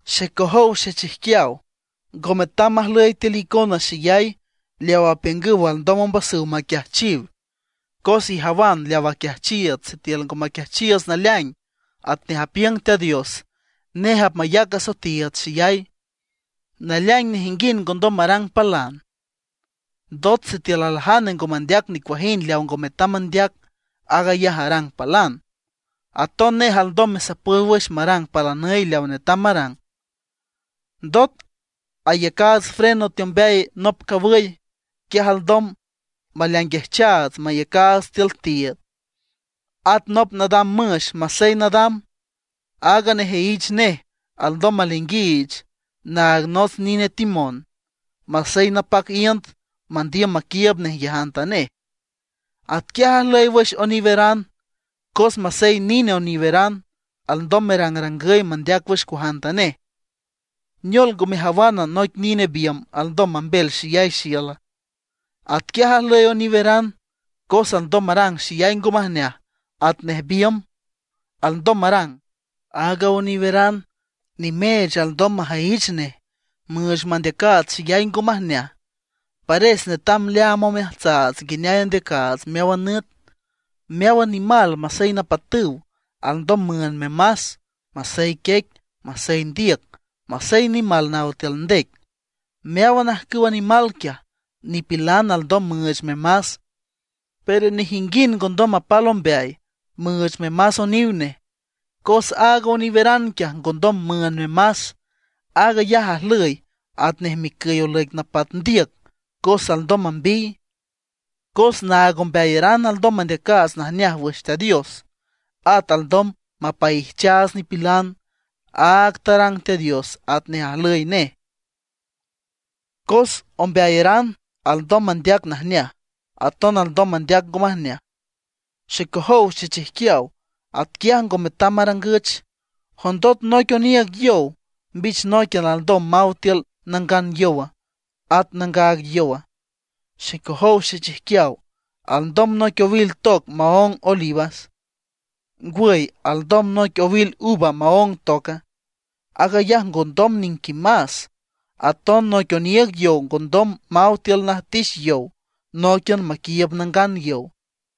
Xecojow xechijquiaw, ngo metam majlüy tiül icona xeyay leawa apiüngüw alndom ombasüw maquiajchiw, cos ijawan leaw aquiajchiiüts sitiül ngo maquiajchiiüts naleaing atnej apiüng Teat Dios, nej apmayac asoetiiüts xeyay. Naleaing nejinguind ngondom marang palan. Ndot sitiül aljane ngo mandeac nicuajind leaw ngo metam mandeac, aag ayaj arang palan. Aton nej alndom mesapüy wüx marang palanüy leaw netam marang. Ndot ayacaats freno teombeay nop cawüy, quiaj alndom maleainguijchaats mayacaats tiül tiiüd. At nop nadam müx masey nadam, aaga nejüyich nej alndom maleainguiich naag nots nine timón, masey napac iünd mandiüm maquiiüb nej nguiajantanej. Atquiaj ajlüy wüx oniweran, cos masey nine oniweran, alndom merangrangüy mandeac wüx cuajantanej. ¿Neol ngo mejawana, noic nine biümb alndom mambel xeyay xiüla? Atquiaj ajlüy oniweran, cos alndom marang xeyay ngo majneaj atnej biümb alndom marang. Aaga oniweran, nimeech alndom majüyich nej müüch mandeacaats xeyay ngo majneaj. Pares netam leaam omeajtsaats nguineay andeacaats meáwan nüt. Meáwan nimal masey napatüw, alndom müünd memas, masey quiec, masey ndiüc, masey nimal naw tiül ndec. Meáwan ajcüwa nimal quiaj, nipilan alndom müüch memas. Pero nejinguind ngondom mapal ombeay müüch memas oniw nej, cos aaga oniweran quiaj ngondom müünd memas. Aag ayaj ajlüy atnej micüy olüic napat ndiüc cos alndom mambiy. Cos naag ombeayaran alndom mandeacaats najneaj wüx Teat Dios; at alndom mapaijchaats nipilan, aag tarang Teat Dios atnej ajlüy nej. Cos ombeayaran alndom mandeac najneaj, aton alndom mandeac ngo majneaj. Xecojow xechijquiaw, atquiay ngo metam marangüch. ¿Jondot, noic oniiüg yow, mbich nóiquian alndom maw tiül nangan yowa, at nangaag yowa? Xecojow xechijquiaw, ¿alndom noic owil toc maóng olívas? ¿Ngwüy alndom noic owil uva maóng toca? ¡Aag ayaj ngondom niquimas! Aton noic oniiüg yow ngondom maw tiül najtix yow nóiquian maquiiüb nangan yow.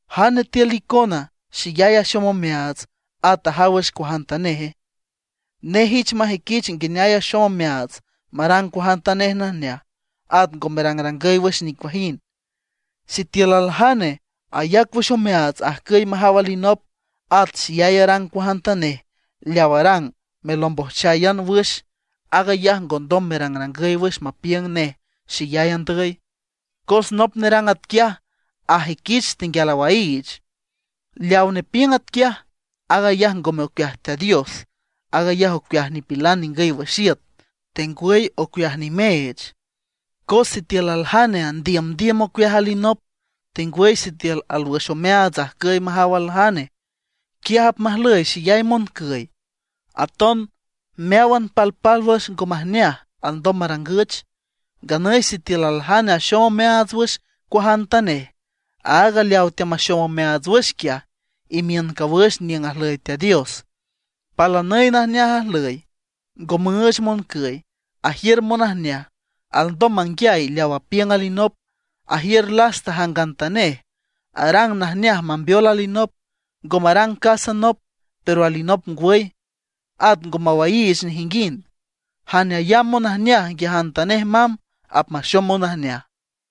¿Jane tiül icona xeyay axom omeaats, at ajaw wüx cuajantaneje? Nej ich majüiquich nguineay axom omeaats marang cuajantanej najneaj, at ngo merangrangüy wüx nicuajind. Sitiül aljane ayac wüx omeaats ajcüy majaw alinop, at xeyay arang cuajantanej leaw arang melombojcháyan wüx; aag ayaj ngondom merangrangüy wüx mapiüng nej xeyay andüy, cos nop nerang atquiaj ajüiquich tenguial awaiich. Leaw nepiüng atquiaj, aag ayaj ngome ocueaj Teat Dios, aag ayaj ocueaj nipilan ningüy wüx iüt, tengwüy ocueaj nimeech. Cos sitiül aljane andiümdiüm ocueaj alinop, tengwüy sitiül alwüx omeaats ajcüy majaw aljane, quiaj apmajlüy xeyay moncüy, aton meáwan palpálwüx ngo majneaj alndom marangüch. Nganüy sitiül aljane axom omeaats wüx cuajantanej, aaga leawa teamaxom omeaats wüx quiaj imiün cawüx niüng ajlüy Teat Dios. Palanüy najneaj ajlüy, ngo müüch moncüy, ajiür monajneaj, alndom manguiay leaw apiüng alinop, ajiür lasta jangantanej, arang najneaj mambeol alinop. Ngo marang casa nop, pero alinop ngwüy; at ngo mawaiich nejinguind. Jane ayamb monajneaj nguiajantanej mamb, apmaxom monajneaj.